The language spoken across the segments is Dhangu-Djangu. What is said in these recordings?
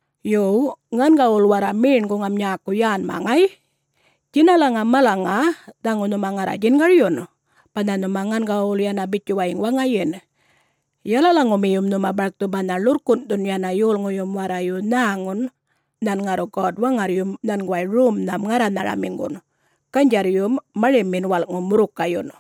Yo, ŋangawul warra meṉguŋam nyäku yänma, ŋay! Djinalaŋa malaŋa dhaŋu nhuma ŋarra djingaryun, banha nhuma ŋangawul yana bitjuwayiŋ waŋayin, yalalaŋumiyum nhuma barkthu banha ḻurrkunꞌthun yana yolŋuyum warrayu nhäŋun nhan ŋarru God-Waŋarryum nhanguway romnham ŋarranharamiŋgun, ganydjarryum marimin walꞌŋu murrukayyun.”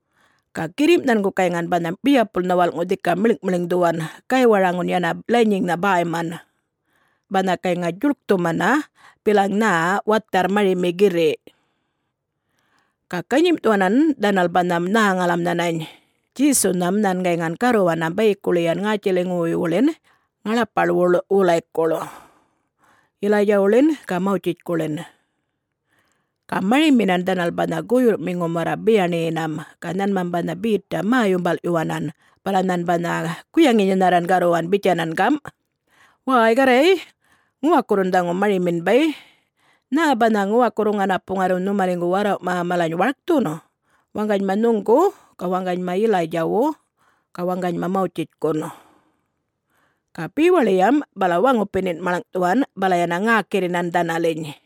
Ga girrimꞌ nhangu gayŋan banha biyapulnha walꞌŋu dhika miḻŋꞌmiḻŋdhuwan, gaywaraŋun yana lanyiŋnha bäyman, banha gayŋa djuḻkthumana bilaŋ nhä watharr marimi girriꞌ. Ga ganyimꞌthuwanan dhanal banha nhäŋalam nhanany Djesunham nhan gayŋan garruwanam bayikuḻiyan ŋätjiliŋuwuywuḻin ŋaḻapaḻwuḻ wulaykuḻ, Yilaydjawuḻin ga Mawtjitjkuḻin. Ga mariminan dhanal banha guyurrꞌmiŋum warra biyaṉiyinam ga nhanmam banha Betam mä-yumbalꞌyuwanan bala nhan banha guyaŋinyanharran garruwanam bitjanan gam, “Wäy Garray, ŋuwakurrun dhaŋu marimin bay! Nhä banha ŋuwakurru ŋanapu ŋarru nhumaliŋgu warrawꞌma malany warkthun?... waŋganyma nhuŋgu ga waŋganyma Yilaydjawu ga waŋganyma Mawtjitjkun?” Ga bewaḻiyam bala waŋupinin maḻŋꞌthuwan bala yana ŋäkirrinan dhanaliny.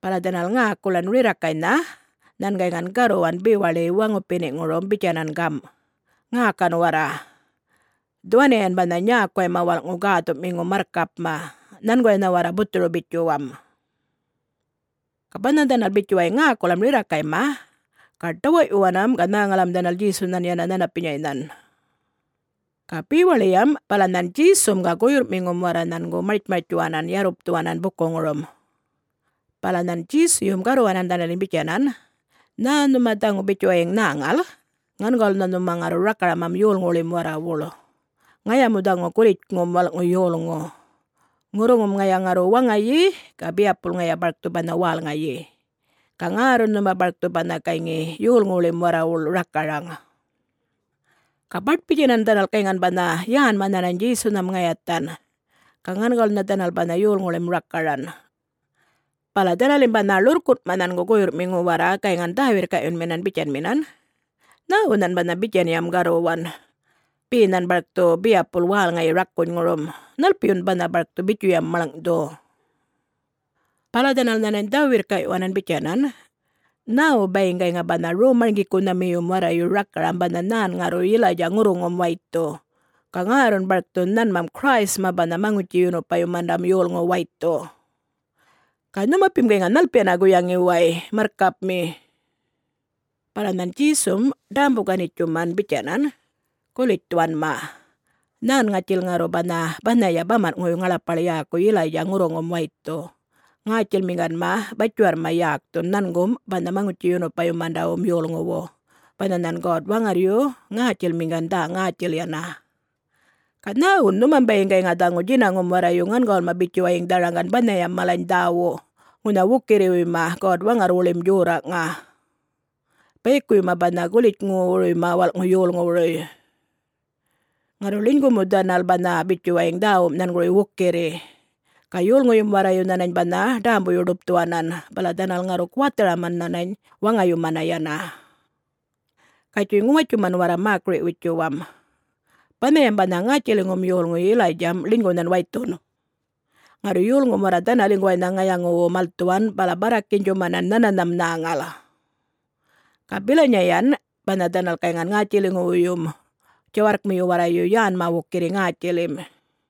Bala dhanal ŋäkulan rirrakaynha nhan gayŋan garruwan bewaḻiya waŋupiniꞌŋurum bitjanan gamꞌ, “Ŋäkan warra! Dhuwaniyan banha nyäkuwayma walꞌŋu gäthuꞌmiŋu marrkapma. Nhanguwaynha warra buthuru-bitjuwam!” Ga banha dhanal bitjuwayiŋ ŋäkulam rirrakayma, ga ḏawaꞌyuwanam ga nhäŋalam dhanal Djesunhan yana nhanapinyaynhan. Ga bewaḻiyam bala nhan Djesum ga guyurrꞌmiŋum warra nhangu martjmartjuwanan yarrupthuwanan bukuŋurum. Bala nhan Djesuyum garruwanan dhanaliny bitjanan, “Nhä nhuma dhaŋu bitjuwayiŋ nhäŋal, ŋangawulnha nhuma ŋarru rakaramam yolŋuwuḻim warrawuḻ. Ŋaya mu dhaŋu Gulitjŋum Walꞌŋu Yolŋu. Ŋurruŋum ŋaya ŋarru waŋayi ga biyapulya ŋaya barkthu banha wälŋayi. Ga ŋärrun nhuma barkthu banha gayŋi yolŋuwuḻim warrawuḻ rakaraŋ.” Ga baṯ-bitjanan dhanal gayŋan banha yänma nhanany Djesunham ŋayathan ga ŋangawulnha dhanal banha yolŋuwuḻim rakaran. Bala dhanalim banha ḻurrkunꞌma nhangu guyurrꞌmiŋu warra gayŋan dhä-wirrkaꞌyunminan bitjanminan, “Nhäwu nhan banha bitjanyam garruwan? Be nhan barkthu biyapul wälŋayi rakunyŋurum? Nhalpiyun banha barkthu bitjuyam maḻŋꞌthu?” Bala dhanal nhanany dhä-wirrkaꞌyuwanan bitjanan, “Nhäwu bayiŋ gayŋa banha Rom-marŋgikunhamiyum warrayu rakaram banha nhan ŋarru Yilaydja ŋurruŋum waythu, ga ŋärrun barkthu nhanmam Christma banha Maŋutji-yunupayumandam yolŋu waythu? Ga nhunupim gayŋa nhalpiyana guyaŋi way, Marrkapmi?” Bala nhan Djesum ḏämbu-ganitjuman bitjanan, “Gulitj dhuwanma. Nhän ŋatjil ŋarru banha banhaya bamanꞌŋuwuy ŋaḻapaḻ yäku Yilaydja ŋurruŋum waythun, ŋätjilmiŋganma batjiwarrma yäkthun nhangum banha Maŋutji-yunupayumandawum Yolŋuwu banha nhan God-Waŋarryu ŋätjilmiŋgan dhä-ŋätjil yana. Ga nhäwun nhumam bayiŋ gayŋa dhaŋu djinaŋum warrayu ŋangawulma bitjuwayiŋ dharaŋgan banhayam malany dhäwu ŋunha wukirriwuyma God-Waŋarrwuḻim djorraꞌŋa, bayikuwuyma banha Gulitjŋuwuruyma Walꞌŋu Yolŋuwuruy? Ŋarru ḻinygu mu dhanal banha bitjuwayiŋ dhäwum nhanguruy wukirri, ga yolŋuyum warrayu nhanany banha ḏämbuyu-ḏupthuwanan bala dhanal ŋarru guwatharaman nhanany waŋayumana yana. Gatjuy ŋuwatjuman warra mäkiri-witjuwam. Banhayam banha ŋätjiliŋum yolŋu Yilaydjam ḻinygu nhan waythun. Ŋarru yolŋum warra dhanaliŋguwaynha ŋayaŋuwu malthuwan bala barrakinydjumanan nhananham nhäŋal. Ga bilinyayan banha dhanal gayŋan ŋätjiliŋuwuyyum djawarrkmiyu warrayu yänma wukirri ŋätjilim.”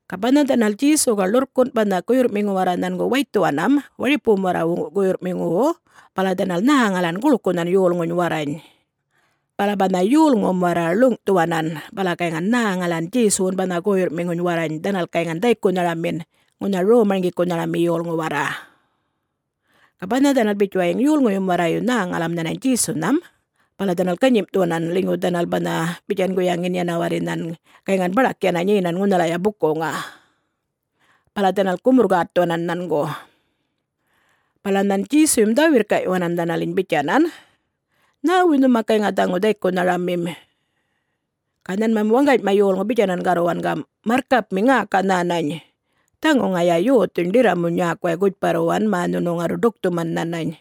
Ga banha dhanal Djesu ga ḻurrkunꞌ banha guyurrꞌmiŋu warra nhangu waythuwanam waripuwum warrawu guyurrꞌmiŋuwu, bala dhanal nhäŋalan guḻkunhan yolŋuny warrany. Bala banha yolŋum warra ḻuŋꞌthuwanan bala gayŋan nhäŋalan Djesuwun banha guyurrꞌmiŋuny warrany dhanal gayŋan dhaykunharamin ŋunha rom-marŋgikunharami yolŋu warra. Ga banha dhanal bitjuwayiŋ yolŋuyum warrayu nhäŋalam nhanany Djesunham bala dhanal ganyimꞌthuwanan ḻinygu dhanal banha bitjan guyaŋin yana warri nhan gayŋan baḏak yana nyenan ŋunhalaya bukuŋa. Bala dhanal gumurr-gätthuwanan nhangu. Bala nhan Djesuyum dhä-wirrkaꞌyuwanan dhanaliny bitjanan, “Nhäwuy nhuma gayŋa dhaŋu dhaykunharamim?” Ga nhanmam waŋganyma yolŋu bitjanan garruwan gamꞌ, “Marrkapmi ŋäka nhänany! Dhaŋu ŋaya yothuny ḏirramuny nyäkuway gutjparruwan mä nhunu ŋarru ḏukthuman nhanany.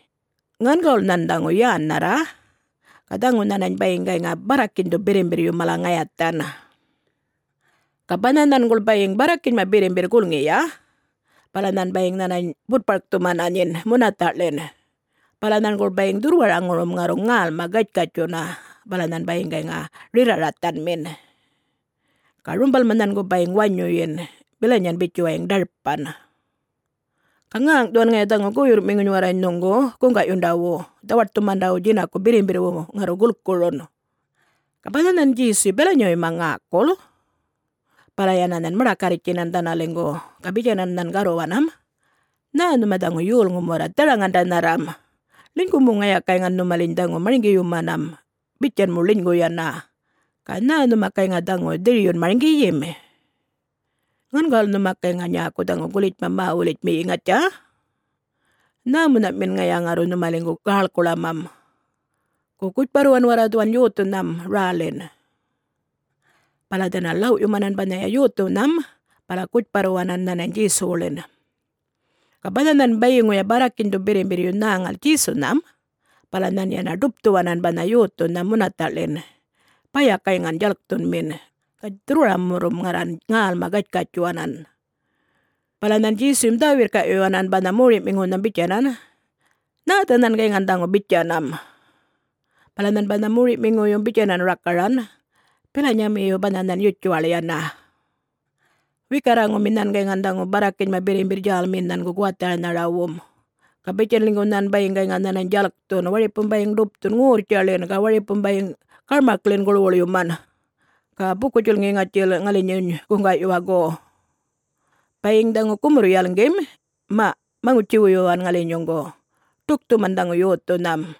Ŋangawul nhan dhaŋu yännharra ga dhaŋu nhanany bayiŋ gayŋa barrakinydhu birrimbirryu mala ŋayathan. Ga banha nhanguḻ bayiŋ barrakinyma birrmbirr gulŋiya bala nhan bayiŋ nhanany butparkthumana nyin munathaꞌḻin. Bala nhanguḻ bayiŋ dhurrwaraŋurum ŋarruŋ ŋälma gatjkatjuna bala nhan bayiŋ gayŋa rirra-rathanmin. Ga rumbalma nhangu bayiŋ wanyuyin bilanyan bitjuwayiŋ ḏarpan. Ga ŋäŋꞌthuwan ŋaya dhaŋu guyurrꞌmiŋuny warrany nhuŋgu guŋgaꞌyundawu, dhawaṯthumandawu djinaku birrimbirrwu, ŋarru gulkurun.” Ga banha nhan Djesuyu bilanyawuyma ŋäkul bala yana nhan maḏakarritjtjinan dhanaliŋgu ga bitjanan nhan garruwanam, “Nhä nhuma dhaŋu yolŋum warra dharaŋandanharram, ḻinygu mu ŋaya gayŋan nhumaliny dhaŋu marŋgiyumanam bitjan mu ḻinygu yana, ga nhä nhuma gayŋa dhaŋu dhiryun marŋgiyim? Ŋangawul nhuma gayŋa nyäku dhaŋu gulitjma mä-wulitjmiyi, ŋatja? Nhämunhaꞌmin ŋaya ŋarru nhumaliŋgu gäḻkuḻamam? Gu, gutjparruwan warra dhuwan yothunham rälin!” Bala dhanal ḻawꞌyumanan banhaya yothunham bala gutjparruwanan nhanany Djesuwuḻin. Ga banha nhan bayiŋuya barrakinydhu birrimbirryu nhäŋal Djesunham bala nhan yana ḏupthuwanan banha yothunham munathaꞌḻin baya gayŋan djalkthunmin, ga dhurrwaramurrum ŋarran ŋälma gatjkatjuwanan. Bala nhan Djesuyum dhä-wirrkaꞌyuwanan banha moriꞌmiŋunham bitjanan, “Nhätha nhan gayŋan dhaŋu bitjanam?” Bala nhan banha moriꞌmiŋuyum bitjanan rakaranan, “Bilinyamiyu banha nhan yutjuwaḻ yana. Wikarraŋumi nhan gayŋan dhaŋu barrakinyma birrimbirr djälmiyin nhangu guwatharanharawum. Ga bitjan ḻinygu nhan bayiŋ gayŋa nhanany djalkthun, waripum bayiŋ ḏupthun ŋorrtjaḻin ga waripum bayiŋ garmakḻin guḻwuḻyuman. Ga buku-djulŋi ŋatjil ŋalinyuny guŋgaꞌyuwa, gu? Bayiŋ dhaŋu gumurr-yalŋgim, maꞌ maŋutji-wuyuwan ŋalinyuŋgu, ḏukthuman dhaŋum yothunham.”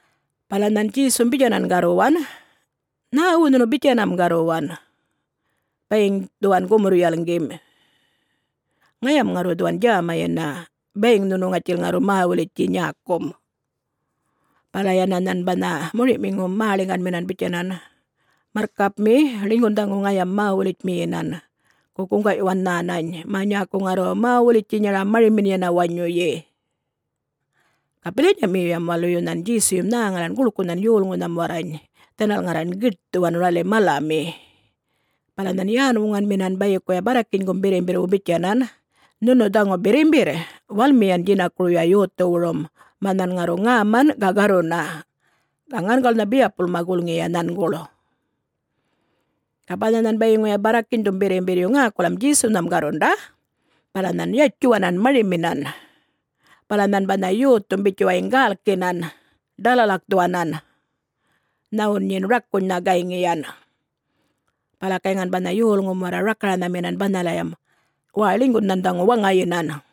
Bala nhan Djesum bitjanan garruwan, “Nhäwu nhunu bitjanam garruwan, ‘Bayiŋ dhuwan gumurr-yalŋgim’? Ŋayam ŋarru dhuwan djäma yana, bayiŋ nhunum ŋatjil ŋarru mä-wulitji nyäkum!” Bala yana nhan banha moriꞌmiŋum mäḻiŋganminan bitjanan, “Marrkapmi, ḻinygun dhaŋu ŋayam mä-wulitjmiyinan. Gu, guŋgaꞌyuwan nhanany, mä nyäku ŋarru mä-wulitjinyaram marimin yana wanyuyi!” Ga bilanyamiyum waluyu nhan Djesuyum nhäŋalan guḻkunhan yolŋunham warrany dhanal ŋarran giṯthuwan räli malami. Bala nhan yän-wuŋanminan bayikuya barrakinygum birrimbirrwu bitjanan, “Nhunu dhaŋu birrimbirr, walmiyan djinakuruya yothuwurum, mä nhan ŋarru ŋäman ga garruna! Ga ŋangawulnha biyapulma gulŋiya nhanguḻ!” Ga banha nhan bayiŋuya barrakinydhum birrimbirryu ŋäkulam Djesunham garrunda, bala nhan yatjuwanam mariminan. Bala nhan banha yothum bitjuwayiŋ gälkinan, ḏalalakthuwanan, nhawun nyin rakunynha gayŋiyan. Bala gayŋan banha yolŋum warra rakaranhaminan banhalayam, “Wäy ḻinygun nhan dhaŋu waŋayinan!”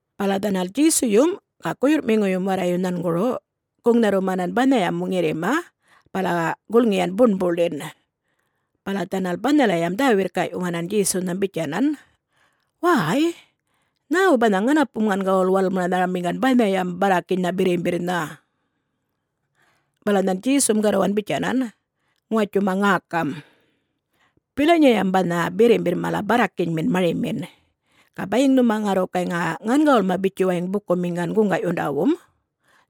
Bala dhanal Djesuyum ga guyurrꞌmiŋuyum warrayu nhanguru guŋnharrumanan banhayam ŋirrima bala gulŋiyan buṉbuḻin. Bala dhanal banhalayam dhä-wirrkaꞌyuwanan Djesunham bitjanan, “Wäy, nhäwu banha ŋanapum ŋangawul walmanharamiŋgan banhayam barrakinynha birrimbirrnha?” Bala nhan Djesum garruwan bitjanan, “Ŋuwatjuma ŋäkam! Bilanyayam banha birrimbirr mala barrakinymin marimin. Ga bayiŋ nhuma ŋarru gayŋa ŋangawulma bitjuwayiŋ bukumiŋgan guŋgaꞌyundawum,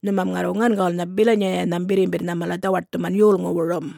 nhumam ŋarru ŋangawulnha bilanyanham birrimbirrnha mala dhawaṯthuman yolŋuwurum.”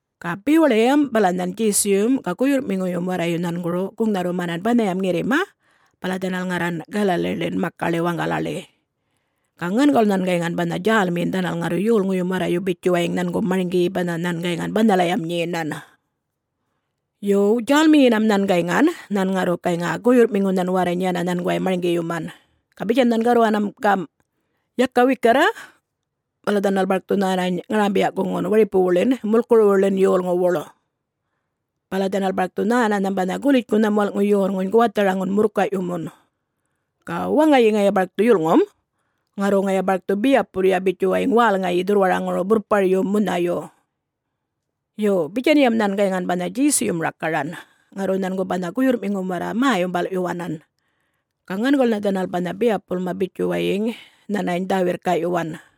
Ga bewaḻiyam bala nhan Djesuyum ga guyurrꞌmiŋuyum warrayu nhanguru guŋnharrumanan banhayam ŋirrima bala dhanal ŋarran Galaliḻin makaḻi waŋgalaḻi. Ga ŋangawul nhan gayŋan banha djälmiyin dhanal ŋarru yolŋum warra bitjuwayiŋ nhangu marŋgiyi banha nhan gayŋan banhalayam nyenan. Yo, djälmiyinam nhan gayŋan, nhan ŋarru gayŋa guyurrꞌmiŋunhan warrany yana nhanguway marŋgiyuman. Ga bitjan nhan garruwanam gamꞌ, “Yaka wikarra, bala dhanal barkthu nhänany ŋarambiya-guŋun waripuwuḻin mulkuruwuḻin yolŋuwuḻ. Bala dhanal barkthu nhänanham banha Gulitjŋunham Walꞌŋu Yolŋuny guwatharaŋun murrkayꞌyumun. Ga waŋayi ŋaya barkthu yulŋum, ŋarru ŋaya barkthu biyapulya bitjuwayiŋ wälŋayi dhurrwaraŋuru burrparyum munhayu.” Yo, bitjanyan nhan gayŋan banha Djesuyum rakaran, ŋarru nhangu banha guyurrꞌmiŋum warra mä-yumbalꞌyuwanan. Ga ŋangawulnha dhanal banha biyapulma bitjuwayiŋ nhanany dhä-wirrkaꞌyuwan.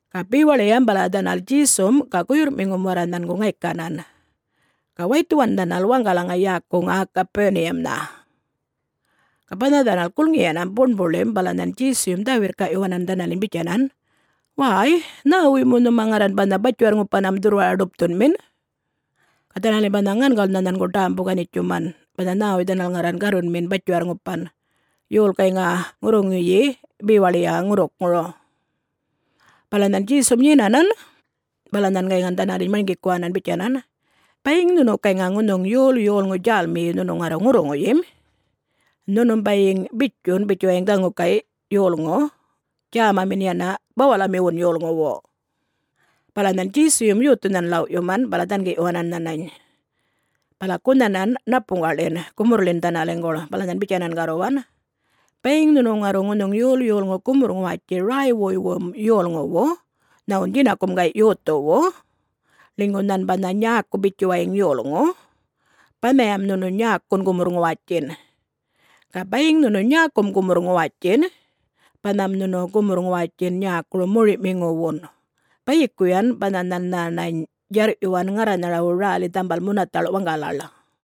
Ga bewaḻiyam bala dhanal Djesum ga guyurrꞌmiŋum warra nhangu ŋaykanan, ga waythuwan dhanal waŋgalaŋa yäkuŋa Gapuniyamnha. Ga banha dhanal gulŋiyanam buṉbuḻim bala nhan Djesuyum dhä-wirrkaꞌyuwanan dhanaliny bitjanan, “Wäy, nhäwuy mu nhuma ŋarran banha batjiwarr-ŋupanam dhurrwara-ḏupthunmin?” Ga dhanalim banha ŋangawulnha nhangu ḏämbu-ganitjuman banha nhäwuy dhanal ŋarran garrunmin batjiwarr-ŋupan, yol gayŋa ŋurruŋuyi bewaḻiya ŋurrukŋuru. Bala nhan Djesum nyenanan bala nhan gayŋan dhanaliny marŋgikuwanan bitjanan, “Bayiŋ nhunu gayŋa ŋunhuŋ yol yolŋu djälmiyi nhunu ŋarru ŋurruŋuyim, nhunum bayiŋ bitjun bitjuwayiŋ dhaŋu gayꞌ yolŋu djämamin yana bawalamiwun yolŋuwu.” Bala nhan Djesuyum yothunhan ḻawꞌyuman bala dhangiꞌyuwanan nhanany, bala gunhanan ṉapuŋggaꞌḻin gumurrḻin dhanaliŋguḻ, bala nhan bitjanan garruwan, “Bayiŋ nhunu ŋarru ŋunhuŋ yol yolŋu gumurr-ŋuwatji räywuywum yolŋuwu nhawun djinakum gay' yothuwu, ḻinygu nhan banha nyäku bitjuwayiŋ yolŋu, banhayam nhunu nyäkun gumurr-ŋuwatjin. Ga bayiŋ nhunu nyäkum gumurr-ŋuwatjin, banham nhunu gumurr-ŋuwatjin nyäkuru mori'miŋuwun, bayikuyan banha nhan nhänany djarr'yuwan ŋarranharawu räli dhambal munathaḻ' waŋgalaḻ.”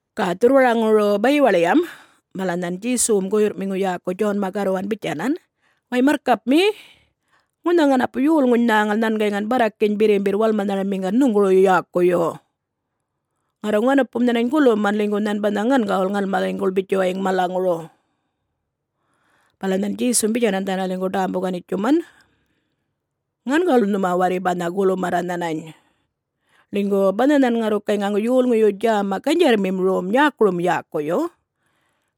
Ga dhurrwaraŋuru bayiwaḻiyam bala nhan Djesuwum guyurrꞌmiŋu yäku Djonma garruwan bitjanan, “Way marrkapmi, ŋunha ŋanapu yolŋuny nhäŋal nhan gayŋan barrakiny birrimbirr walmanharamiŋgan nhuŋguru yäkuyu. Ŋarru ŋanapum nhanany guluman ḻinygu nhan banha ŋangawul ŋalmaliŋguḻ bitjuwayiŋ malaŋuru.” Bala nhan Djesum bitjanan dhanaliŋgu ḏämbu-ganitjuman, “Ŋangawul nhuma warri banha gulumarra nhanany. Ḻinygu banha nhan ŋarru gayŋa yolŋuyu djäma ganydjarrmim rom nyäkurum yäkuyu,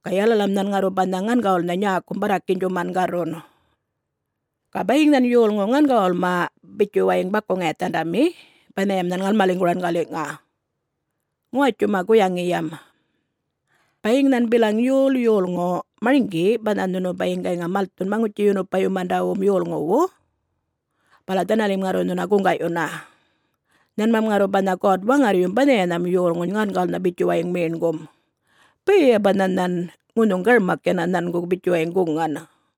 ga yalalam nhan ŋarru banha ŋangawulnha nyäkum barrakinydjuman garrun. Ga bayiŋ nhan yolŋu ŋangawulma bitjuwayiŋ baku-ŋayathandami, banhayam nhan ŋalmaliŋguran galiꞌŋa. Ŋuwatjuma guyaŋiyam! Bayiŋ nhan bilaŋ yol yolŋu marŋgi banha nhunu bayiŋ gayŋa malthun Maŋutji-yunupayumandawum yolŋuwu, bala dhanalim ŋarru nhuna guŋgaꞌyuna. Nhanmam ŋarru banha God-Waŋarryum banhayanham yolŋuny ŋangawulnha bitjuwayiŋ meṉgum, bayaya banha nhan ŋunhuŋ garmak yana nhangu bitjuwayiŋ guŋan.”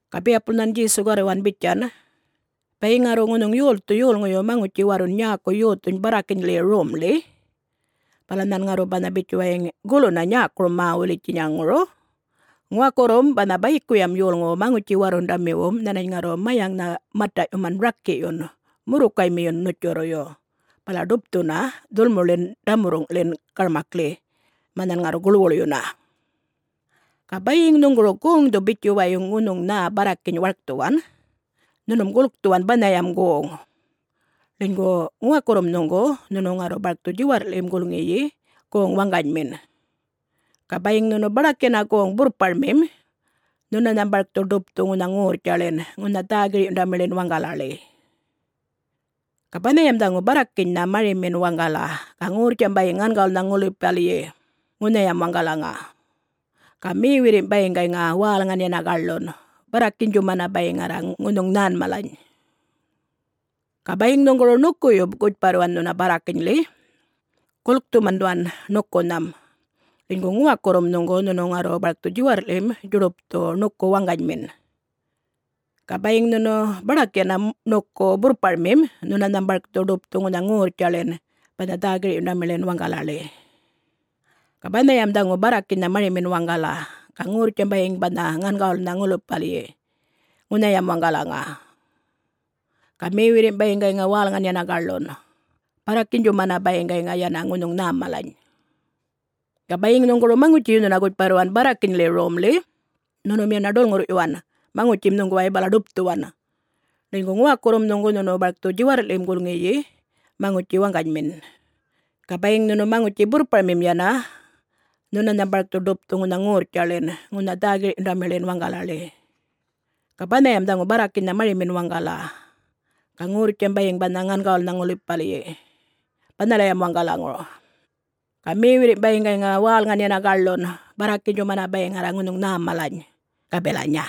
Ga biyapul nhan Djesu garruwan bitjan, “Bayiŋ ŋarru ŋunhuŋ yolthu yolŋuyu maŋutji-warrun nyäku yothuny barrakinyḻi romḻi, bala nhan ŋarru banha bitjuwayiŋ guluna nyäkurum mä-wulitjinyaŋuru, ŋuwakurrum banha bayikuyam yolŋuwu maŋutji-warrundamiwum nhanany ŋarru mayaŋnha mataꞌyuman rakiꞌyun, murrukaymiyun ṉutjurruyu, bala ḏupthuna dhulmuḻin ḏamurruŋꞌḻin garmakḻi, mä nhan ŋarru guḻwuḻyuna. Ga bayiŋ nhuŋguru goŋdhu bitjuwayiŋ ŋunhuŋ nhä barrakiny warkthuwan, nhunum gulkthuwan banhayam goŋ. Ḻinygu ŋuwakurrum nhuŋgu nhunu ŋarru barkthu djiwarrꞌḻim gulŋiyi goŋ waŋganymin. Ga bayiŋ nhunu baḏak yana goŋ-burrparmim, nhunanham barkthu ḏupthu ŋunha ŋorrtjaḻin ŋunha dhä-girꞌyundamiḻin waŋgalaḻi. [Ga banhayam dhaŋu barrakinynha marimin waŋgala. Ga ŋorrtjam bayiŋ ŋangawulnha ŋulipalyi ŋunhayam waŋgalaŋa. Ga mewirrimꞌ bayiŋ gayŋa wälŋan yana gaḻun, barrakinydjumana bayiŋ ŋarra ŋunhuŋ nhäm malany.] Ga bayiŋ nhuŋguru ṉukuyu gutjparruwan nhuna barrakinyḻi, gulkthuman dhuwan ṉukunham. Ḻinygu ŋuwakurrum nhuŋgu nhunu ŋarru barkthu djiwarrꞌḻim djuḏupthu ṉuku waŋganymin. Ga bayiŋ nhunu baḏak yana ṉuku burrparmim nhunanham barkthu ḏupthu ŋunha ŋorrtjaḻin banha dhä-girꞌyundamiḻin waŋgalaḻi. [Ga banhayam dhaŋu barrakinynha marimin waŋgala. Ga ŋorrtjam bayiŋ banha ŋangawulnha ŋulipalyi ŋunhayam waŋgalaŋa. Ga mewirrimꞌ bayiŋ gayŋa wälŋan yana gaḻun, barrakinydjumana bayiŋ gayŋa yana ŋunhuŋ nhäm malany.] Ga bayiŋ nhuŋguru maŋutjiyu nhuna gutjparruwan barrakinyḻi romḻi, nhunum yana ḏulŋurrꞌyuwan maŋutjim nhuŋguway bala ḏupthuwan, ḻinygu ŋuwakurrum nhuŋgu nhunu barkthu djiwarrꞌḻim gulŋiyi maŋutji waŋganymin, ga bayiŋ nhunu maŋutji burrparmim yana, nhunanham barkthu ḏupthu ŋunha ŋorrtjaḻin ŋunha dhä-girꞌyundamiḻin waŋgalaḻi. ‘Ga banhayam dhaŋu barrakinynha marimin waŋgala. Ga ŋorrtjam bayiŋ banha ŋangawulnha ŋulipalyi banhalayam waŋgalaŋa. Ga mewirrimꞌ bayiŋ gayŋa wälŋan yana gaḻun, barrakinydjumana bayiŋ ŋarra ŋunhuŋ nhäm malany,’ ga bilanya.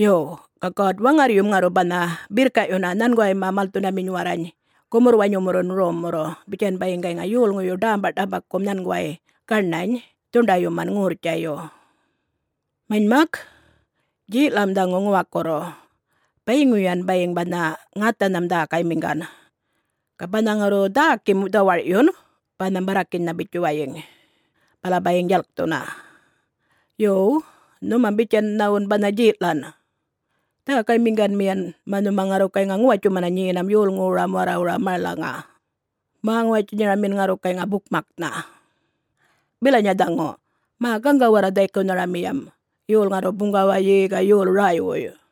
Yo, ga God-Waŋarryum ŋarru banha birrkaꞌyuna nhanguwayma malthundaminy warrany gumurr-wanyumurrun rommurru, bitjan bayiŋ gayŋa yolŋuyu ḏämbaꞌḏambakum nhanguway gaṉany dhuṉḏayyuman ŋorrtjayu. Manymak, djeꞌlam dhaŋu ŋuwakurru, bayiŋuyan bayiŋ banha ŋathanham dhäkaymiŋgan. Ga banha ŋarru dhäkim dhawarꞌyun banham barrakinynha bitjuwayiŋ, bala bayiŋ djalkthuna. Yo, nhumam bitjan nhawun banha djeꞌlan, dhäkaymiŋganmiyan mä nhuma ŋarru gayŋa ŋuwatjumana nyenam yolŋuwuram warrawura malaŋa, mä-ŋuwatjinyaramin ŋarru gayŋa bukmaknha. [Bilanya dhaŋu! Mä gaŋga warra dhaykunharamiyam, yol ŋarru buŋgawayi ga yol räywuy!”]